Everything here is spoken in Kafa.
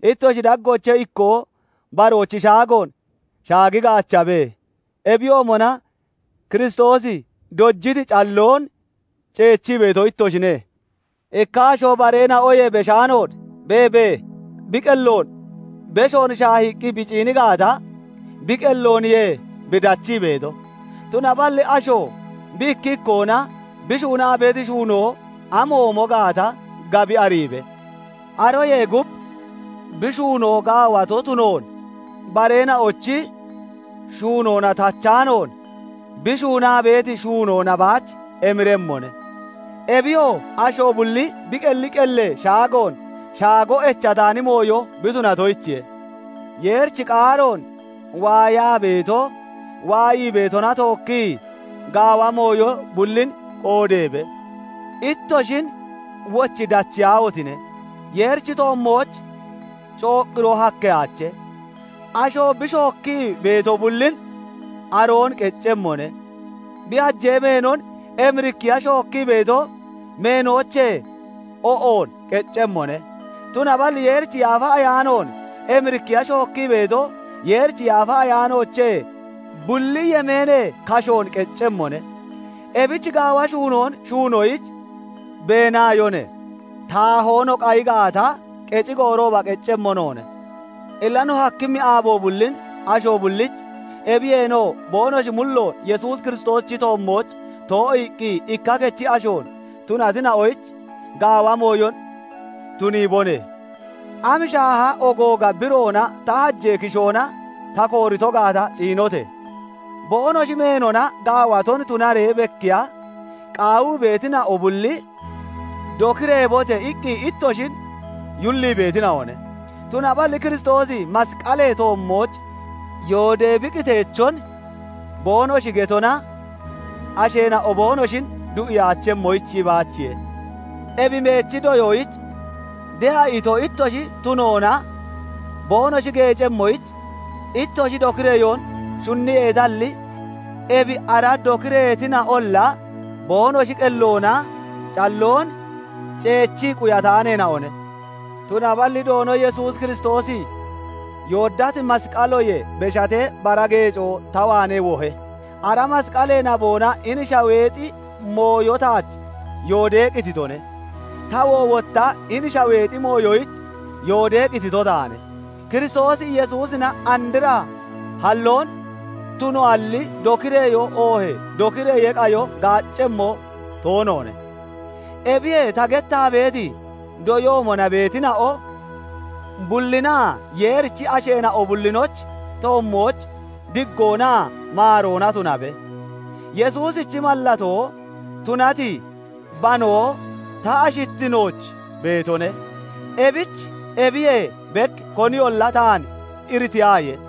Ittoshi daggoochee ikkoo baroochi shaagoon shaagi gaachabe; ebiyoomona Kiristoosi dojiti calloon ceechii beeto ittoshine. Ikka asho bareena'oyee beshaanoon beebee bi qelloon beshoon shaahiqqi bi ciini gaata, bi qellooniye bi dachii beeto. Tunaballi asho bi ikki ikkoona bi shuunati shuunoo amoomo gaata gabi ariibe; aroyee gub bi shuunoo gaawato tunoon bareena'ochi shuunoona tachaanoon bi shuunaa beeti shuunoona baach emiremmone. Ebiyoo, asho bulli bi qelli qellee shaagoon shaago echataani mooyo bi tunatoyichiye. Yeerichi qaaroon waayaa beeto waayii beetona tookki gaawa mooyo bullin qoodeebe. Ittoshin wochi dachiyaahotine! Yeerichi toommooch cooqqiroo hakkeyaache; asho bi shookkii beeto bullin aroon qeccemmone; Bi hajee meenon emirikkiya shookkii beeto meenoochee o'on qeccemmone; tunaballi Yeerichi Yaafa Ayaanoon emirikkiya shookkii beeto Yeerichi Yaafa Ayaanoochee bulli yemeenee kashoon qeccemmone. Ebich gaawa shuunoon shuunoyich beenaayone. Taahoo no qayi gaata, qecci goorooba qeccemmo noone. Illa no hakkimmi aabo bullin asho bullich, ebiyeenoo boonoshi mulloon Yesuus Kiristoosichi toommooch too'iiqqi ikka kechi ashoon tunatina'oyich, gaawa mooyon tuniibone. Am shaaha ogooga biroona ta hajee kishoona ta koorito gaata ciinote! Boonoshi meenona gaawaton tunaree bekkiya qaawii beetina'o bulli "Dokireebote!" iqqi ittoshin yullii beetina'one. Tunaballi Kiristoosi masqalee toommooch yoodee bi qiteechon boonoshi getona asheena'o boonoshin du'iyaachemmoyich baachiye. Ebi meechi doyoyich de'a ito ittoshi tunoona boonoshi geecemmoyich ittoshi dokireyoon shunniyeetalli, ebi ara dokireetina'olla boonoshi qelloona calloon ceechii quyataaneena'one. Tunaballi Doono Yesuus Kiristoosi yooddati masqaloyee beshatee bara geecoo ta waanee wohe; ara masqalee naboona hini shaweexi mooyo taach yoodee qititone; tawoo wotta hini shaweexi mooyoyich yooddee qitito taane. Kiristoos Yesuusina andra halloon tunoalli, dokireyoo oohee dokireyee qayo gaaccemmo toonoone. Ebi ta gettaa beeti doyoomona beetina'o bullinaa Yeerichi asheena'o bullinochi toommooch diggoonaa maaroona tunabe. Yesuusichi mallatoo tunati banoo ta ashittinooch beetone. Ebich ebiyee bek koniyolla taan iritiyaaye.